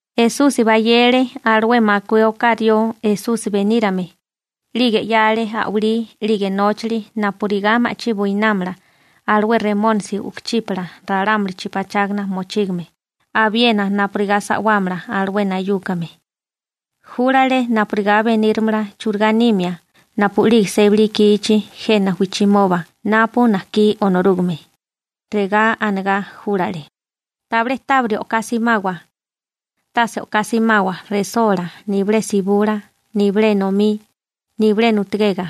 Esusi bayele alué makué oká rió Esusi benírame, 'lige 'yale a'walí 'lige nóchali napurigá ma'chí buinámala alué remónisi u'kuchípala ralámulichi pachágana mochígame abiena napurigá sa'wámala alué nayúkame. Júlale napurigá beníramala churigá nimia napu'lige sébali ikichi jena wijchimoba napu najkí Onorúgame, Regá anegá júlale: ―Tabilé tábiri o'ká simawa. Tase o'ká simawa resola, nibilé sibula, nibilé enomí, nibilé nutugega.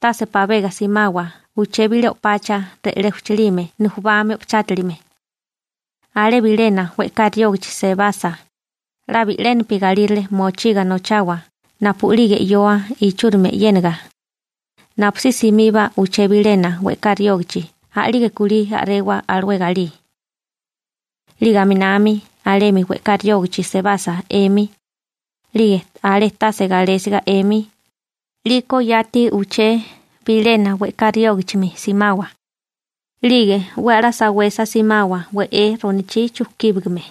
Tase pabega simawa uché bilé o'pacha re'lé ujchalime nujubami o'pachátilime. Alé bilena we'ká riógachi sebasa, 'la bi'lénapi galírale mochiga nochawa napu'lige 'yoa ichúrimi e'yéniga, napusí simiba uché bilena we'ká riógachi a'lige kulí a'rewa alué galí. 'Lige aminami alemi we'ká riógachi sebasa 'emi, 'lige alé tase galésiga 'emi, 'liko yati uché bilena we'ká riógichimi simawa. 'Lige 'we a'lá sawesa simawa we'é ronochí chujkíbigame.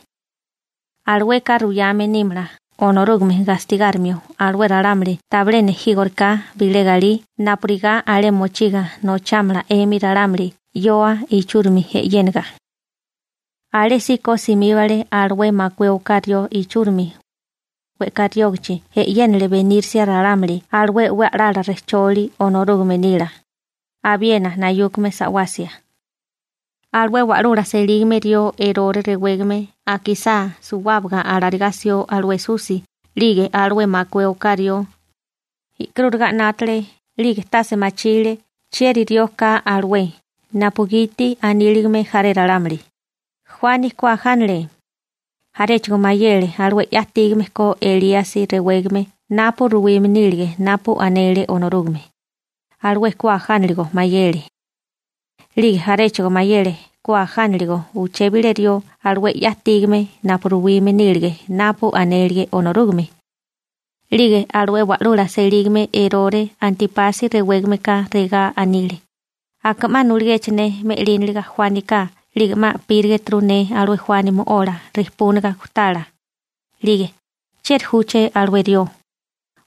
Alueka ruyame nímala Onorúgame gastigárimio alué ralámuli tabilé nejígoriká bilé galí napurigá alé mochiga nochámala 'emi ralámuli 'yoa ichúrimi e'yéniga. Alésíko simíbale alué makué oká rió ichúrimi, we'ká riógachi e'yénale benírisia ralámuli alué 'we a'lala rejcholi Onorúgame nila, abiena nayúkame sa'wasia. Alué wa'lula selígame rió Erore rewégame akisá suwábaga alarigá 'sió alué Esusi 'lige alué makué oká rió, e'karúriga 'nátale 'lige tase machile chieri rió ka alué napugiti aníligame jaré ralámuli: ―Juani ku ajánale. Jaréchigo mayele alué 'ya ajtígame ko Elíasi rewégame napu ruwime nílige napu anele Onorúgame, alué ku ajánaligo mayele. 'Lige jaréchigo mayele ku ajánaligo uché bilé rió alué 'ya ajtígame napu ruwime nílige napu anélige Onorúgame. 'Lige alué wa'lula selígame Erore Antípasi rewégameka regá anile: ―Aka 'ma nuligéché ne me'líniliga Juánika 'lige 'ma a'pírigeturu ne alué Juani mo'ola rijpúniga gujtala, 'lige ¿chieri júché alué rió?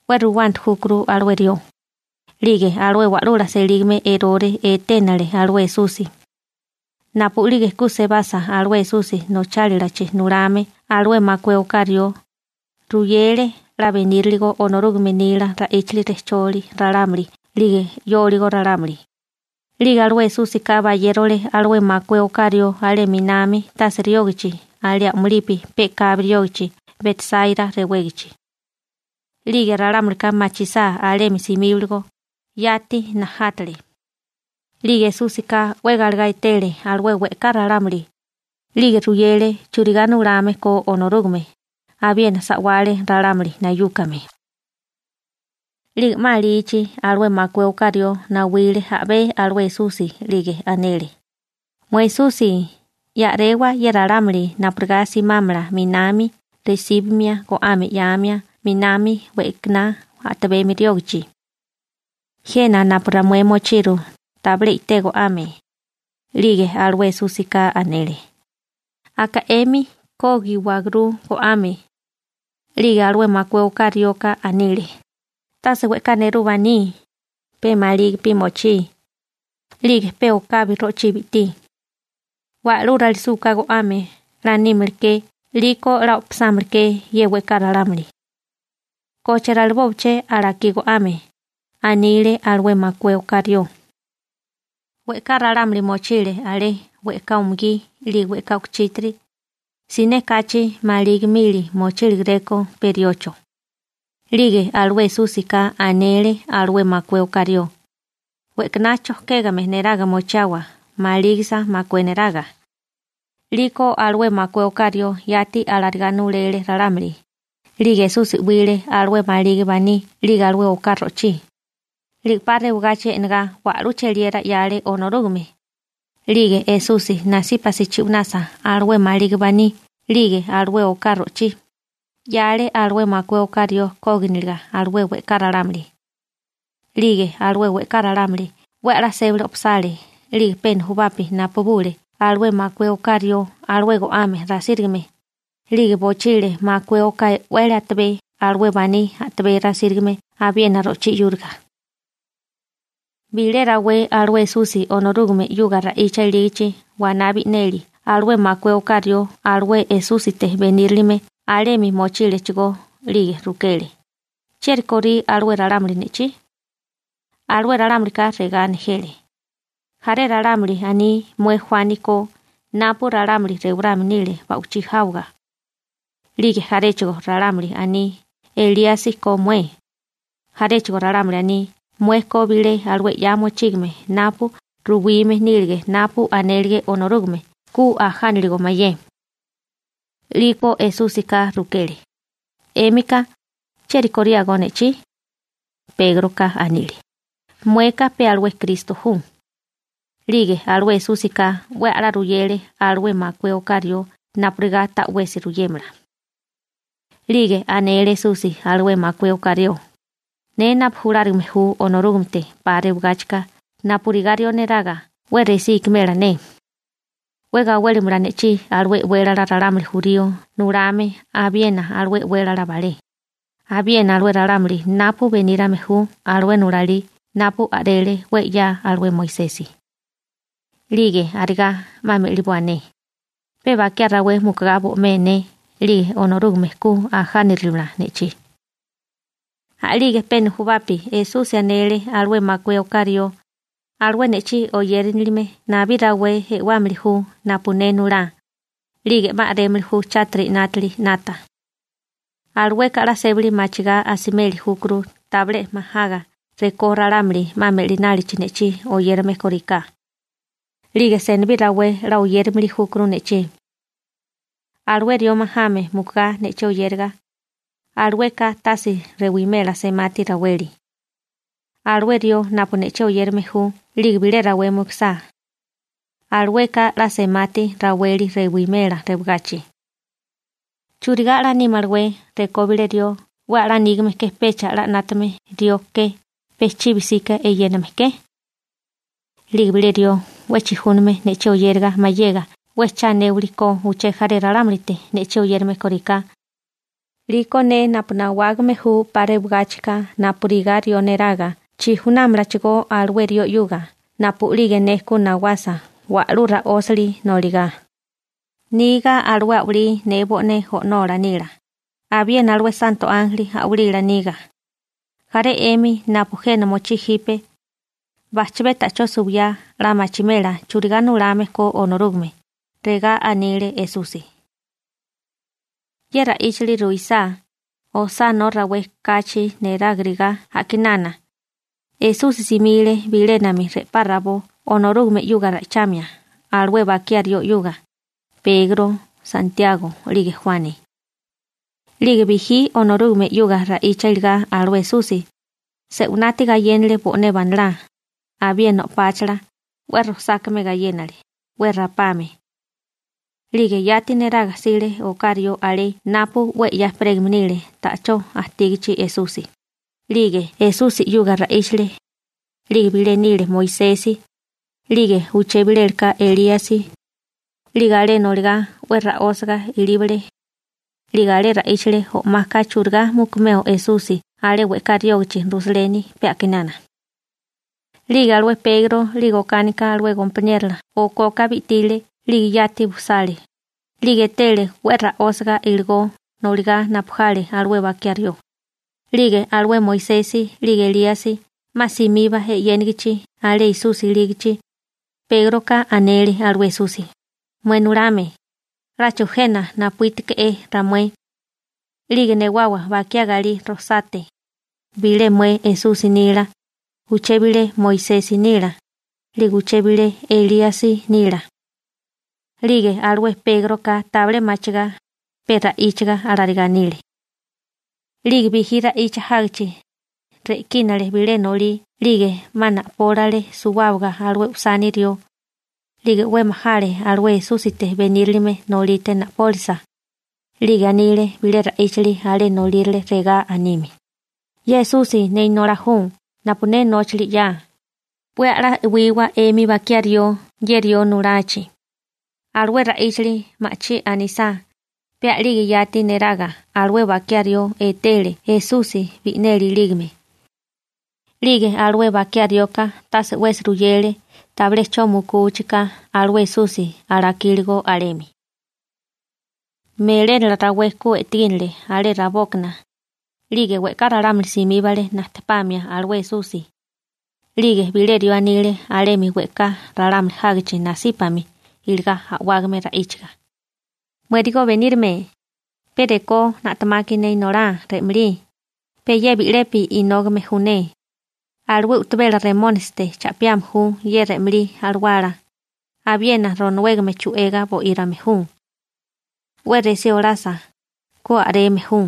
'We ruwanti júkuru alué rió. 'Lige alué wa'lula selígame Erore eténale alué Esusi. Napu'lige ku sebasa alué Esusi nochálilachi nulame alué makué oká rió, ruyele 'la beníriligo Onorúgame nila ra'íchali rejcholi ralámuli 'lige 'yóligo ralámuli. 'Lige alué Esúsika bayérole alué makué oká rió alé 'minami tase riógachi alé a'mulipi pe'kabi riógachi Betsáira rewégachi. 'Lige ralámulika machisá alemi simíbaligo, yati najátale. 'Lige Esúsika 'we galegá etele alué we'ká ralámuli, 'lige ruyele churigá nulame ko Onorúgame, abiena sa'wale ralámuli nayúkame. 'Lige 'ma alichi, alué makué oká rió nawile a'bé alué Esusi, 'lige anele: ―Mué Esusi, ya a'rewa ye ralámuli napurigá simámala 'minami resíbamia go'ame 'yáamia 'minami we'kaná a'tabemi riógachi. Jena napu ramué mochiru tabilé i'té go'ame. 'Lige alué Esúsika anele: ―Aka 'emi kógiwagurú go'ame. 'Lige alué makué oká rioka anile: ―Tase we'ká nerú baní, pe malígipi mochí, 'lige pe okabi ro'chí bi'tí. Wa'lú ralisúká go'ame 'la nímaleké 'liko 'la o'pasámaleké ye we'ká ralámuli. ¿Koche ralibóaché alakí go'ame? ―anile alué makué oká rió. We'ká ralámuli mochile alé, we'ká umugí 'lige we'ká u'kuchítiri. Siné kachi maligi mili mochíligeréko pe riocho. 'Lige alué Esúsika anele alué makué oká rió: ―We'kaná chojkégame neraga mochiawa malígisa makué neraga. 'Liko alué makué oká rió yati alarigá nulele ralámuli. 'Lige Esusi 'wile alué maligi baní 'lige alué oká ro'chí, 'lige 'pa rewagachi e'negá iligá wa'lú cheliera 'yale Onorúgame. 'Lige Esusi nasípasi chi'wanasa alué maligi baní 'lige alué oká ro'chí, 'yale alué makué oká rió kóginiliga alué we'ká ralámuli. 'Lige alué we'ká ralámuli 'we a'lá sébali o'pasale, 'lige pe nujubapi napubule alué makué oká rió alué go'ame rasírigame, 'lige bochile makué oká e'wele atabé alué baní a'tabé rasírigame abiena ro'chí 'yúriga. Bilé rawé alué Esusi Onorúgame 'yuga ra'icha ilígachi waná bi'neli alué makué oká rió alué Esúsite benírilime alemi mochílechigó. 'Lige rukele: ―¿Chieri korí alué ralámuli ne'chí? Alué ralámulika regá nejele: ―Jaré ralámuli aní mué Juani ko napu ralámuli rewarame nile ba'wichí jáwaga. 'Lige jaréchigo ralámuli aní Elíasi ko mué. Jaréchigo ralámuli aní mué ko bilé alué 'ya mochígame napu ruwígame nílige napu anélige Onorúgame ku ajánaligo mayé. 'Liko Esúsika rukele: ―'Émika ¿chieri koriágó ne'chí? Pégroka anile: ―Mueka pe alué Kristo ju. 'Lige alué Esúsika 'we a'lá ruyele alué makué oká rió napurigá ta'wesi ruyémala. 'Lige anele Esusi alué makué oká rió: ―Ne napu julárigame ju Onorúgamete 'pa rewagáchika napurigá rió neraga 'we resí ikimela ne. 'We gawélimala ne'chí alué e'wélala ralámuli jurío nulame abiena alué e'wélala balé, abiena alué ralámuli napu benírame ju alué nulalí napu a'rele 'we 'ya alué Moisesi. 'Lige arigá 'ma me'liboa ne, pe bakiá rawé mukugá bo'mé ne 'lige Onorúgame ku ajánirimala ne'chí. A'lige pe nujubapi Esusi anele alué makué oká rió: ―Alué ne'chí oyérinilime, nabí rawé e'wámili ju napu ne nulá, 'lige 'ma a'rémili ju chátiri 'nátili 'nata. Alueka 'la sébali machigá asimeli júkuru tabilé majaga rekó ralámuli 'ma me'linálichi ne'chí oyérame kóriká. 'Lige senibí rawé 'la oyérimili júkuru ne'chí. Alué rió majame mukugá ne'chí oyériga, alueka tase rewimela semati raweli. Alué rió napu ne'chí oyérame ju 'lige bilé rawé mukusá, alueka 'la semati raweli rewimela rewagachi. ¿Churigá 'la nímalawé rekó bilé rió 'we a'lá nígame ke peka 'la 'nátame rió ke pe chibi 'sika eyéname ke? 'Lige bilé rió 'we chijúname ne'chí oyériga mayega 'we cha anéwali ko uché jaré ralámulite ne'chí oyérame kóriká, 'liko ne napu nawágame ju 'pa rewagáchika napurigá rió neraga chijunámalachigó alué rió 'yuga napu'lige ne ku nawasa wa'lú ra'ósili noligá, niga alué a'walí ne bo'né O'nola nila, abiena alué santo ánjeli a'walila niga. Jaré 'emi napu jena mochí jipe, bajchabé ta'chó suwiyá 'la machimela churigá nulame ko Onorúgame ―regá anile Esusi. Ye ra'íchali ruisá, osánó rawé kachi nerágirigá a'kinana, Esusi simile bilénami re'pá rabó Onorúgame 'yuga ra'ichamia alué bakiá rió 'yuga, Pegro, Santiago, 'lige Juani. 'Lige bijí Onorúgame 'yuga ra'icha iligá alué Esusi, se'winati gayénale bo'né banalá, abiena o'páchala, 'we rojsákame gayénale, 'we rapame. 'Lige yati neraga jsile oká rió alé napu 'we 'ya ejperégame nile ta'chó ajtígachi Esusi, 'lige Esusi 'yuga ra'íchale. 'Lige bilé nile Moisesi, 'lige uché bilélaka Elíasi. 'Lige alé noligá 'we ra'ósaga ilíbale. 'Lige alé ra'íchale o'maka churigá mukimeo Esusi alé we'ká riógachi Rusaleni pe a'kinana. 'Lige alué Pegro 'lige okánika alué gompaniérola okoka bi'tile 'lige yati bujsale, 'lige etele 'we ra'ósiga iligó noligá napu jale alué bakiá rió. 'Lige alué Moisesi 'lige Elíasi 'ma simiba e'yénigichi alé Esusi ilígachi, Pégroka anele alué Esusi: ―Mué nulame, 'láchigo jena napuítuke'é ramué. 'Lige newawa bakiá galí rojsate, bilé mué Esusi nila, uché bilé Moisesi nila, 'lige uché bilé Elíasi nila. 'Lige alué Pégroka tabilé machigá, pe ra'íchaga alarigá anile. 'Lige bijí ra'icha jágichi, re'kínale bilé nolí 'lige 'ma na'pólale suwábaga alué usani rió. 'Lige 'we majale alué Esúsite benírilime nolite na'pólisa. 'Lige anile bilé ra'íchali alé nolírale regá anime: ―Ye Esusi ne Inolá ju napu ne nóchali 'ya, 'we a'lá e'wiwa 'emi bakiá rió ye rió nulachi. Alué ra'íchali ma'chí anisá, pe a'lige yati neraga alué bakiá rió etele Esusi bi'neli ilígame. 'Lige alué bakiá rioka tase 'wesi ruyele tabilé 'cho mukuchi ka alué Esusi alakíligo alemi. Melénala rawé ku e'tegínele alé rabókana, 'lige we'ká ralámuli simíbale najtepamia alué Esusi. 'Lige bilé rió anile alemi we'ká ralámuli jágichi nasípami iligá a'wágame ra'íchaga: ―Muérigo Benírame, pe rekó na'temaki ne inolá re'malí, pe ye bi'lepi inógame ju ne. Alué u'tabela remónisite cha'piame ju ye re'malí alawala, abiena ronowégame chu'ega bo'írame ju. 'We resí olasa, ku a'reme ju.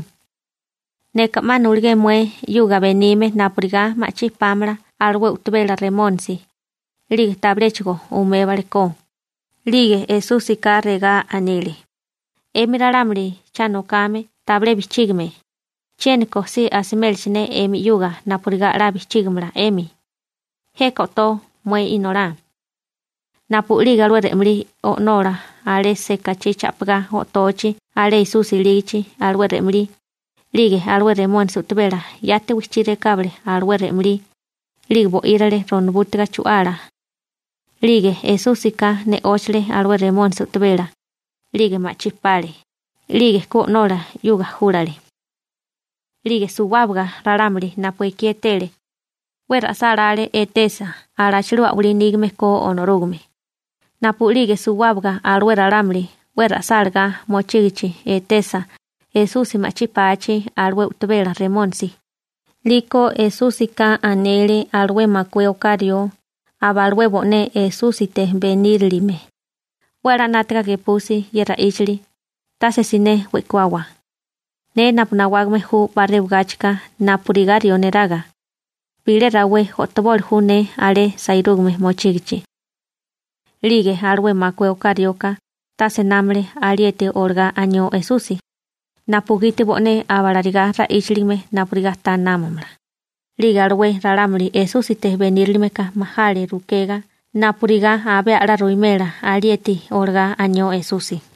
Neka 'ma nulugé mué 'yuga benime napurigá ma'chí pámala alué u'tabela remónisi, 'lige tabiléchigo umébalekó. 'Lige Esúsika regá anile: ―'Emi ralámuli cha nokame tabilé bijchígime, chiéniko si asimélaché ne 'emi 'yuga napurigá 'la bijchígamala 'emi. Jeka o'tó mué inolá. Napu'lige alué re'malí o'nola alé sekachí cha'pigá o'tochi alé Esusi ilígachi alué re'malí, 'lige alué remónisi u'tabela yati wijchí rekábale alué re'malí, 'lige bo'írale ronobútiga chu'ala. 'Lige Esúsika ne'óchale alué remónisi u'tabela, 'lige ma'chí pale. 'Lige ku o'nola 'yuga júlale. 'Lige suwábaga ralámuli napu ekí etele, 'we ra'sálále etesa alachilú a'walí nígame ko Onorúgame. Napu'lige suwábaga alué ralámuli 'we ra'sálagá mochígichi etesa Esusi ma'chí pachi alué u'tabela remónisi, 'liko Esúsika anele alué makué oká rió aba alué bo'né Esúsite benírilime: ―'We a'lá 'nátaga gepusi ye ra'íchali, tase siné we'kuawa: Ne napu nawágame ju 'pa rewagáchika napurigá rió neraga, bilé rawé o'toboli ju ne alé sairúgame mochígichi. 'Lige alué makué oká rioka tase námale alieti olagá anió Esusi, napugiti bo'né abalarigá ra'íchaligame napurigá ta námamala, 'lige alué ralámuli Esúsite benírilimeka majale rukegá napurigá abé a'lá ruwimela alieti olagá anió Esusi.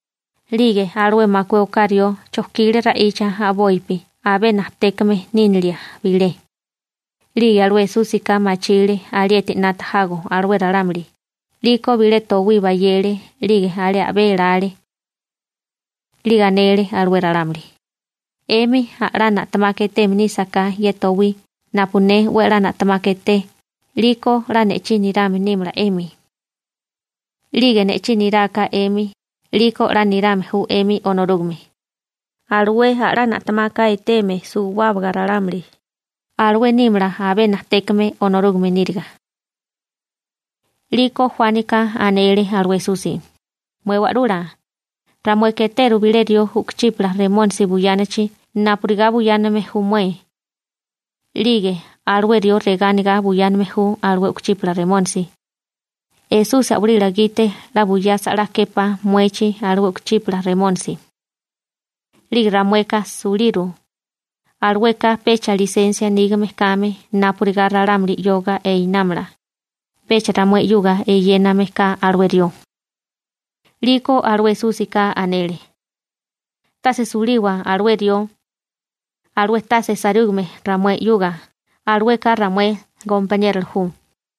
'Lige alué makué oká rió chojkile ra'icha a'bopi abé najtékame nínilia bilé. 'Lige alué Esúsika machile alieti 'nata jago alué ralámuli, 'liko bilé towí bayele 'lige alé a'bé elale. 'Lige anele alué ralámuli: ―'Emi a'lá na'temaka etéeme nísaká ye towí napu ne 'we a'lá na'temaka eté 'liko 'la ne'chí nirame nímala 'emi. 'Lige ne'chí niráká 'emi, 'liko 'la nirame ju 'emi Onorúgame. Alué a'lá na'temaka eteme suwábaga ralámuli, alué nímala abé najtékame Onorúgame níriga. 'Liko Juánika anele alué Esusi: ―Mué Wa'lula, ramueka eteru bilé rió u'kuchípala remónisi buyánachi napurigá buyáname ju mué. 'Lige alué rió regá anigá buyáname ju alué u'kuchípala remónisi: «Esusi a'walila gite 'la buyasa 'la képá muechi alué u'kuchípala remónisi.» 'Lige ramueka suliru, alueka pecha lisensia nígame kame napurigá ralámuli 'yoga einámala, pecha ramué 'yuga eyéname ka alué rió. 'Liko alué Esúsika anele: ―Tase suliwa alué rió. Alué tase sairúgame ju ramué 'yuga, alueka ramué gompaniérola ju.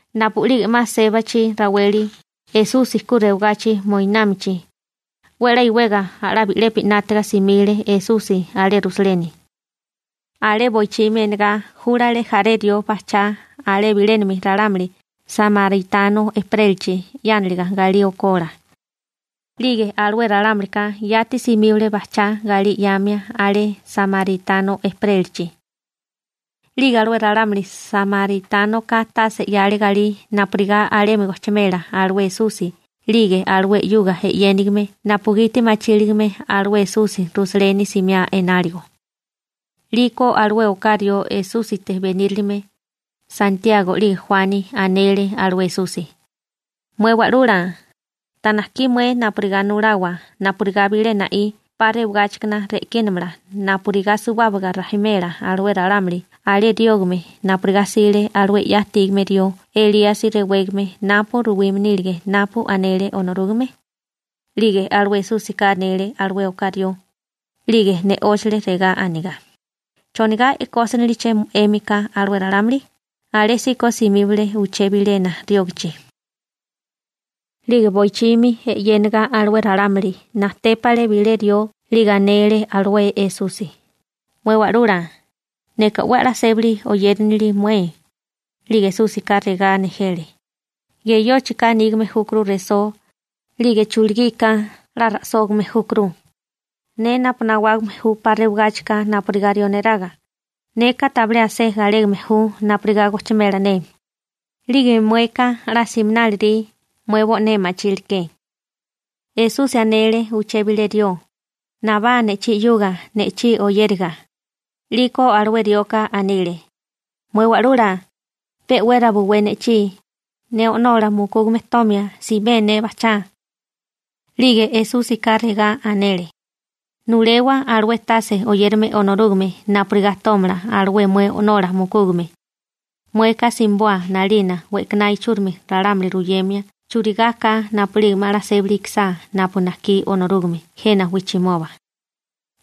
Napu'lige 'ma sébachi raweli Esusi ku rewagachi moinámichi, 'we 'la iwega a'lá bi'lepi 'nátaga simile Esusi alé Rusaleni. Alé boichimi enegá júlale jaré rió bajchá alé bilénami ralámuli samaritano ejperélachi 'yániliga galí okola. 'Lige alué ralámulika yati simíbale bajchá galí 'yamia alé samaritano ejperélachi. 'Lige alué ralámuli samaritánoka tase 'yale galí napurigá alemi gojchimela alué Esusi 'lige alué 'yuga e'yénigime napugiti machíligame alué Esusi Rusaleni simiá enáligo. 'Liko alué oká rió Esúsite benírilime, Santiago 'lige Juani, anele alué Esusi: ―Mué Wa'lula, ¿ta najkí mué napurigá nulawa napurigá bilé na'í 'pa rewagáchikana re'kínamala napurigá suwábaga rajimela alué ralámuli alé riógame napurigá 'sile alué 'ya ajtígame rió Elíasi rewégame napu ruwime nílige napu anele Onorúgame? 'Lige alué Esúsika e'nele alué oká rió, 'lige ne'óchale regá anigá: ―¿Chonigá e'kósiniliché 'émika alué ralámuli? Alésíko simíbale uché bilena riógachi. 'Lige boichimi e'yéniga alué ralámuli, najtépale bilé rió 'lige anele alué Esusi: ―Mué Wa'lula, neka 'we a'lá sébali oyérinili mué. 'Lige Esúsika regá nejele: ―Geyóchika nígame júkuru resó, 'lige chulugika 'la ra'sógame júkuru. Ne napu nawágame ju 'pa rewagáchika napurigá rió neraga, neka tabilé asé galégame ju napurigá gojchimela ne. 'Lige mueka 'la siminálirí, mué bo'né ma'chíleké. Esusi anele uché bilé rió: ―Nabá ne'chí 'yuga ne'chí oyériga. 'Liko alué rioka anile: ―Mué Wa'lula, pe'wera buwé ne'chí, ne o'nola mukúgame tomia simé ne bajchá. 'Lige Esúsika regá anele: ―Nulewa alué tase oyérame Onorúgame napurigá tómala alué mué o'nola mukúgame. Mueka simiboa 'nalina we'kaná ichúrimi ralámuli ruyemia churigá ka napu'lige 'ma 'la sébali ikisá napu najkí Onorúgame jena wijchimoba.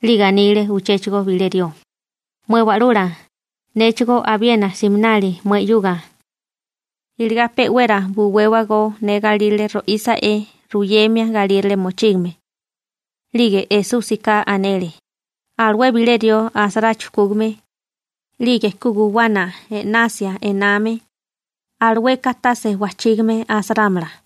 'Lige anile uchéchigo bilé rió: ―Mué Wa'lula, néchigó abiena siminali mué 'yuga. Iligá pe'wera buwéwago ne galírale ro'ísa'é ruyemia galírale mochígame. 'Lige Esúsika anele: ―Alué bilé rió asará chujkúgame, 'lige ku guwana e'nasia ename, alueka tase wajchígame asarámala.